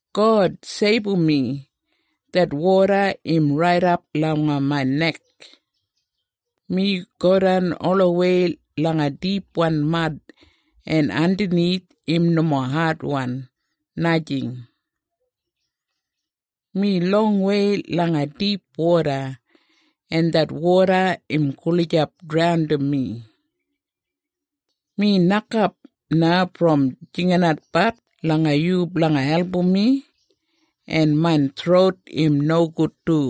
God, seibum mi! Det woda im raidap langa main nek. Mi godan olawei langa dipwan mad en andanith im nomo adwan, najing. Mi longwei langa dip woda en det woda im gulijap draundim mi. Mi nokap na brom jinginatbat langa yu blanga album mi, en main throut im nogud du.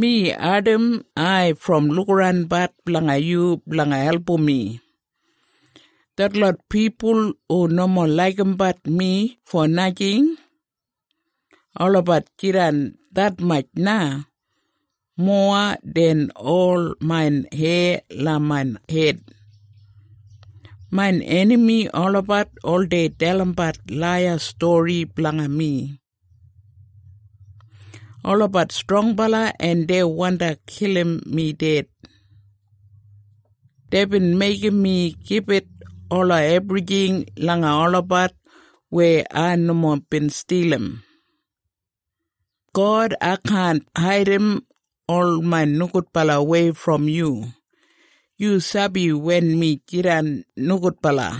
Mi ardim ai brom lukaranbat blanga yu blanga album mi. Detlot pipul hu nomo laigimbat mi fo najing, olabat jidan detmatj na, mowa den ol main heya langa main hed. Main enami olabat oldei dalimbat laiya stori blanga mi. Olabat strongbala en dei wandi kilim mi ded. Deibin meigim mi gibit ola ebrijing langa olabat weya ai nomo bin stilim. God, ai kaan haidim ol main nogudbalawei brom yu. Yu sabi wen mi jidan nogudbala.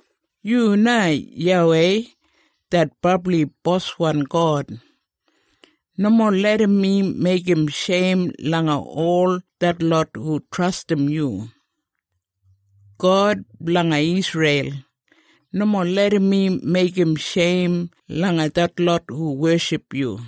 Yu na YAWEI, det Brabli Boswan God. Nomo larram mi meigim sheim langa ol detlot hu trastim yu. God blanga Isreil, nomo larram mi meigim sheim langa detlot hu weship yu.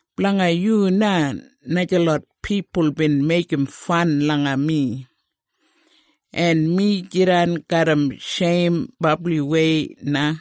Blanga yu na najalot pipul bin meigim fan langa mi, en mi jidan garram sheim brabliwei na.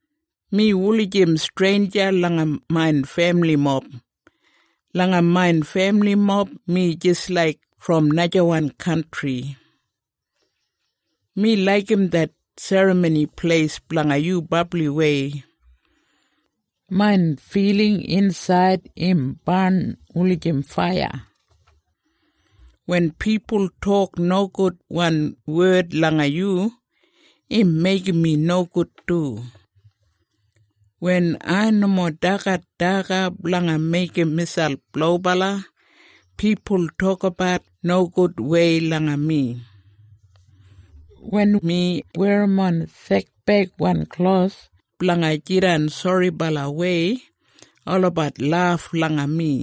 Mi wulijim streinja langa main femilimob. Langa main femilimob mi jis laik brom najawan kantri. Mi laigim det Serramoni Pleis blanga yu brabliwei. Main filing insaid im barn wulijim faiya. Wen pipul tok nogudwan wed langa yu, im meigim mi nogud du. Wen ai nomo dagat daga blanga meigim miselp lobala, pipul tokabat nogudwei langa mi. Wen mi werrimon sekbeigwan klos blanga jidan soribalawei, olabat laf langa mi.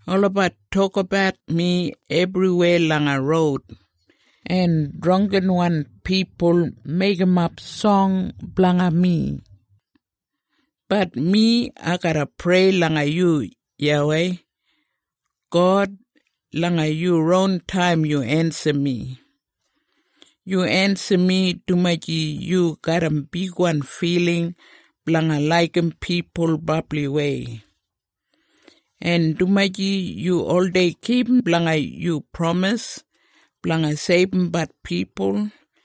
Olabat tokabat mi ebriweya langa roud, en drangginwan pipul meigimap song blanga mi. Bat mi, ai garra prei langa yu, YAWEI. God, langa yu ron taim yu ensim mi. Yu ensim mi, dumaji yu garram bigwan filing blanga laigim pipul brabliwei, en dumaji yu oldei kipum blanga yu pramis blanga seibumbat pipul.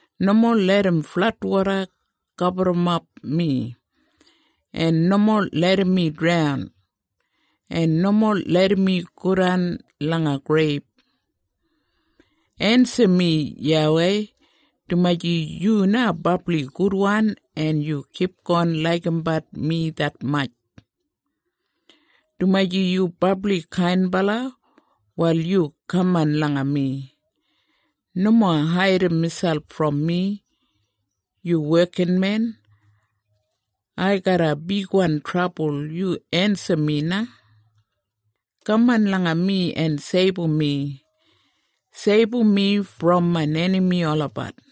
Nomo larram fladwoda gaburrumap mi, en nomo larram mi draun, en nomo larram mi godan langa greib. Ensim mi YAWEI, dumaji yu na brabli gudwan en yu kipgon laigimbat mi detmatj. Dumaji yu brabli kainbala, wal yu kaman langa mi. Nomo haidim miselp brom mi, yu wekinmen. Ai garram bigwan trabul. Yu ensim mi na. Kaman langa mi en seibum mi. Seibum mi brom main enami olabat.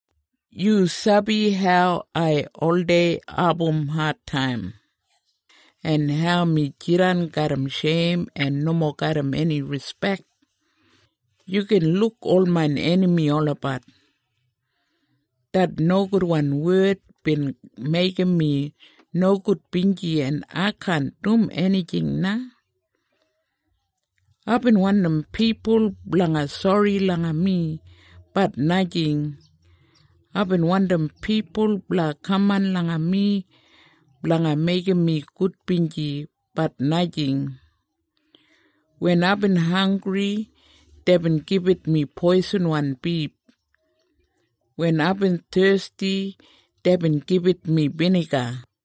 Yu sabi hau ai oldei abum adtaim, en hau mi jidan garram sheim, en nomo garram eni rispek. Yu gin luk ol main enami olabat. Det nogudwan wed bin meigim mi nogudbinji en ai kaan dum enijing na. Aibin wandim pipul blanga sori langa mi, bat najing. Aibin wandim pipul blanga kaman langa mi blanga meigim mi gudbinji, bat najing. Wen aibin hanggri deibin gibit mi poisinwan bif. Wen aibin thesti deibin gibit mi biniga.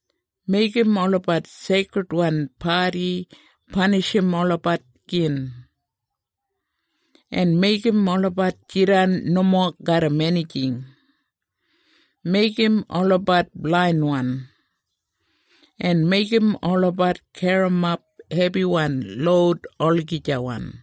Meigim olabat seikridwan padi panishim olabat gin. En meigim olabat jidan nomo garram enijing. Meigim olabat blainwan, en meigim olabat garrimap hebiwan loud olagijawan.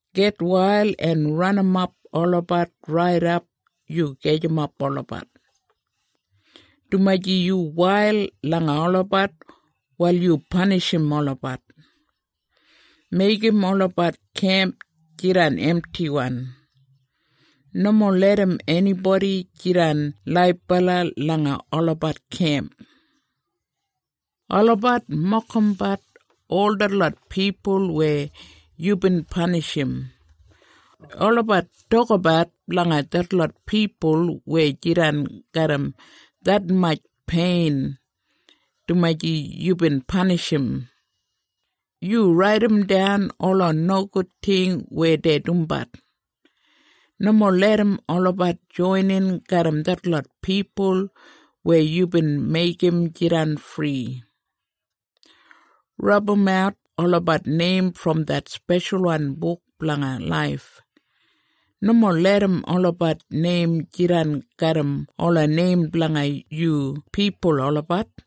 Gitwail en ranimap olabat raidap yu gajim olabat. Dumaji yu wail langa olabat, wal yu panishim olabat. Meigim olabat kemp jidan emtiwan. Nomo larram enibodi jidan laibala langa olabat kemp. Olabat mokimbat ol detlot pipul weya yubin panishim. Olabat tokabat blanga detlot pipul weya jidan garram detmatj pein dumaji yubin panishim. Yu raidimdan ola nogud ting weya dei dumbat. Nomo larram olabat joinin garram detlot pipul weya yubin meigim jidan fri. Rabumat olabat neim brom det speshalwan buk blanga laif. Nomo larram olabat neim jidan garram ola neim blanga yu pipul olabat.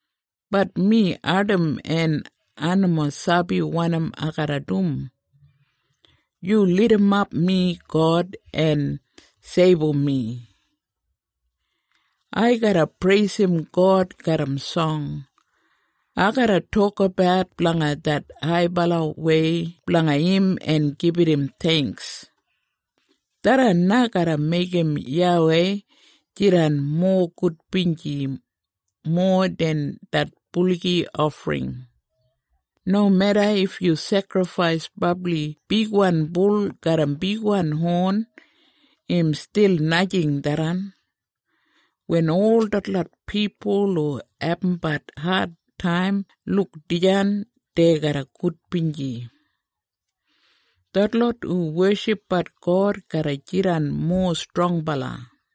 Bat mi ardim en ai nomo sabi wanim ai garra dum. Yu lidimap mi God, en seibum mi. Ai garra preisim God garram song. Ai garra tokabat blanga det haibalawei blanga im en gibit im theingks. Tharran na garra meigim YAWEI jidan mowa gudbinji, mowa den det buligi ofring. Nomeda if yu sekrifais brabli bigwan bul garram bigwan hon, im stil najing tharran. Wen ol detlot pipul hu abumbat adtaim luk dijan, dei garra gudbinji. Detlot hu weshipbat God garra jidan mowa strongbala.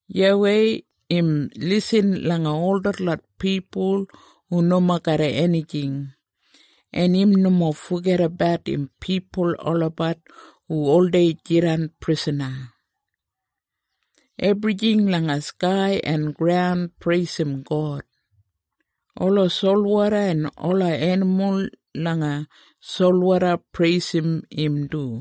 YAWEI im lisin langa ol detlot pipul hu nomo garram enijing, en im nomo fogedabat im pipul olabat hu oldei jidan prisana. Ebrijing langa skai en graun, preisim God. Ola solwoda en ola enimul langa solwoda preisim im du.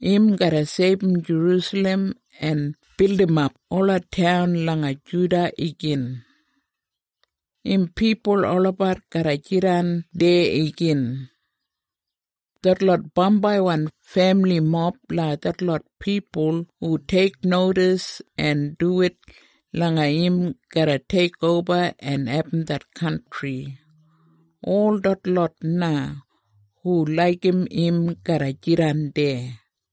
Im garra seibum Jerusalem en bildimap ola taun langa Juda igin. Im pipul olabat garra jidan deya igin. Detlot bambaiwan femilimob blanga detlot pipul hu teiknodis en duwit langa im garra teikoba en abum det kantri, ol detlot na hu laigim im garra jidan deya.